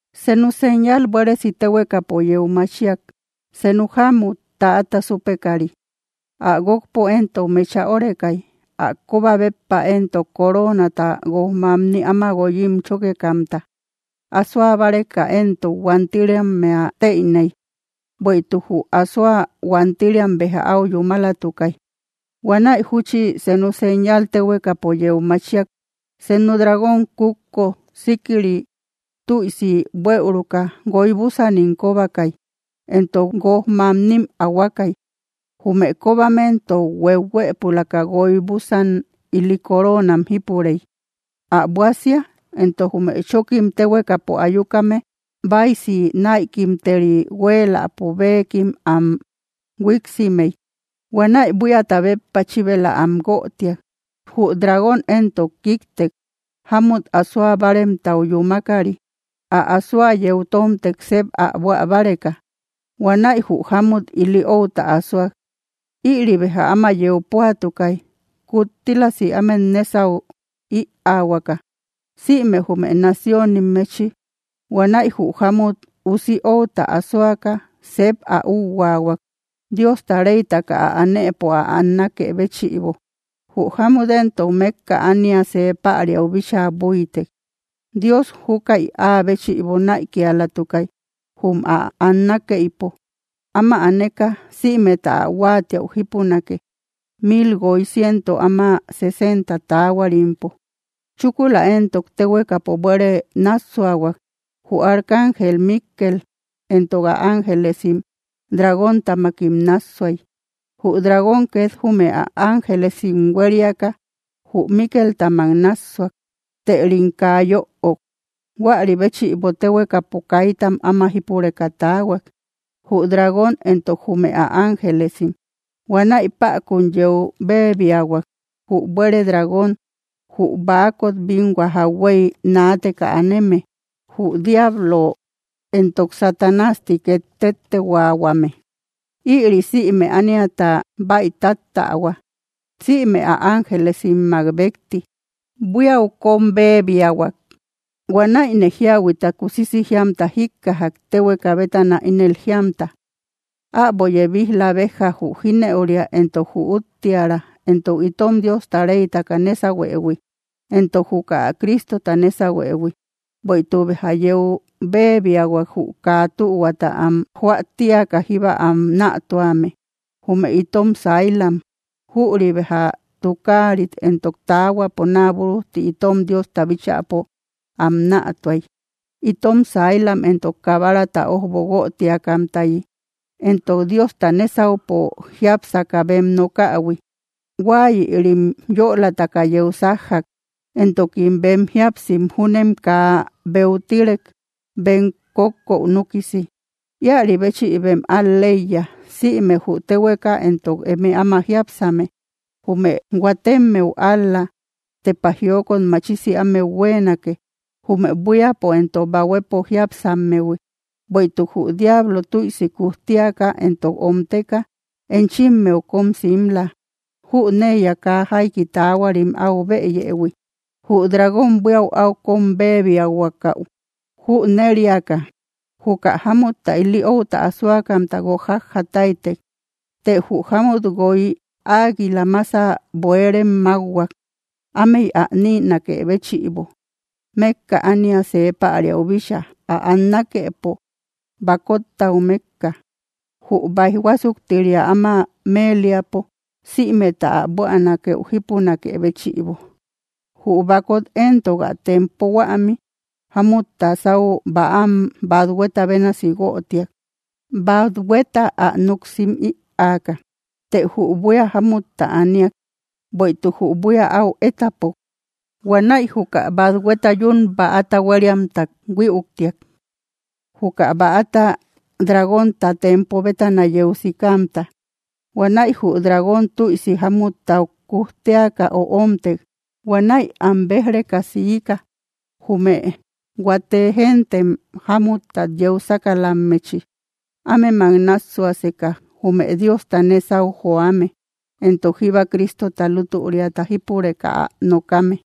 Senu señal buéresi téhuekapo yeu machiak: senu jámmut, täata súpekari. Ä guókpo éntok mecha órekay. Ä kóba béppa éntok, coroonata guoj mamni áma guoyim chókekamta. Asoa báreka éntok, huantiriammea tëiney, bueïtuk jü asoa huantiriam béja áu yúmalatukay. Huanäi jútchi, senu señal téhuekapo yeu machiak: senu dragón kútko síkiri tüisi buëuruka, guoy búsanim kóbakay, entok guoj mamnim ahuakay. Jume kóbam éntok hueuhuëpulaka guoy búsan ili coroonam jípurey. Ä buásia éntok, jume chókim téhuekapo ayukame báisi näikimteri huéeläpo béekim am huíksimey. Huanäi buíata béppa chíbela am guötiak. Jü dragón éntok kíktek, jámut asoa báaremtau yúmakari, ä asoa yeu tómtek sep ä buä báreka. Huanäi jü jámut ili outa asoak. Ïri béja áma yeu púatukay, kuttílasi ámet nésau ïaahuaka, sïme jume naciónimmechi. Huanäi jü jámut usi outa asoaka sep ä úuhuahuak, Diosta reytaka ä anëpo ä annakë béchïbo. Jü jámut éntok mékka ánia see päriau bíchaa búitek; Dios júkäi áa béchïbo näikialatukay, jum ä annakeïpo. Áma aneka, sïmeta ä huáatiäu jípunake, mil guoy ciento áma sesenta taahuarimpo. Chúkula éntok, téhuekapo buere nássuahuak: Jü arcángel Míkkel éntok ä ángelesim dragóntamakim nássuay. Jü dragón két jume ä ángelesim huériaka, jü Míkeltamak nássuak, tërim kaa yöok. Huäri béchïbo téhuekapo kaitam áma jípureka taahuak, jü dragón entok jume ä ángelesim. Huanäi päkun yeu béebiahuak, jü buere dragón, jü baakot binhua jauhuey naateka aneme, jü diablo entok Satanás ti két téttehuaahuame. Íri sïme ániata bäi táttähua. Sïme ä ángelesimmak békti buíau kóm béebiahuak. Huanäine jíahuita kusisi jíamta jíkkajak téhueka bétana, ínel jíamta: —Äbo yebij‑la béjja jü jínëuria, entok jü úttiära, entok itom Diosta reytaka nésahuëhui, entok juka Cristota nésahuëhui. Bueïtuk béja yeu béebiahuak, jü kaa tühuata am joä tíaka jíba am nätuame, jume itom sailam. Jüri béja tukaarit entok taahuapo naa búrujti itom Diosta bíchäpo am nätuay. Itom sailam éntok Kabarata ójbo guötiakamtayi entok Diosta nésaupo jiápsaka bem nokähui, huáayïrim yölataka yeu sájjak; entokim bem jíapsim júnem kaa beutirek, bem kókkou núkisi. ¡Íäri béchïbem al‑leiya, sïme jü téhueka, entok eme áma jiápsame! ¡Jume huatemmeu ál‑la tepa jiokot machisi ámeu huéenake, jume buíapo entok bahuepo jiápsammehui, bueïtuk jü diablo, tüisi kujtiaka entok omteka, enchimmeu kóm simla; jüneiya kaa jaiki taahuarim áu bëyëhui! Jü dragón, buíau áu kóm béebiahuakau jüneriaka, juka jámutta ili outa asoakamta guók jájja táytek. Të jü jámmut guoy águila mása bueerem mákhuak, ámey ä nïnakë béchïbo, mékka ánia see päriau bícha, ä annakepo, bakottau mékka, jum báij huásuktiria áma méeliapo sïmeta ä buänakeu jípunakë béchïbo. Jü bakot éntok, ä tempo huämi, jámutta sáu bäam bathueta bénasi guötiak, bathueta ä núk sim ïaaka. Të jü buía jámutta aniak, bueïtuk jü buía áu étapok. Huanäi juka bathueta yún bäata huériamta huïuktiak, juka bäata dragónta tempo bétana yeu sikamta. Huanäi jü dragón tüisi jámuttau kujteaka öomtek. Huanäi am béj‑reka siika, jume huate gentem jámuttat yeu sákalammechi, ámemak nássuaseka, jume Diosta nésau joame, entok jíba Cristota lútüriata jípureka ä nokame.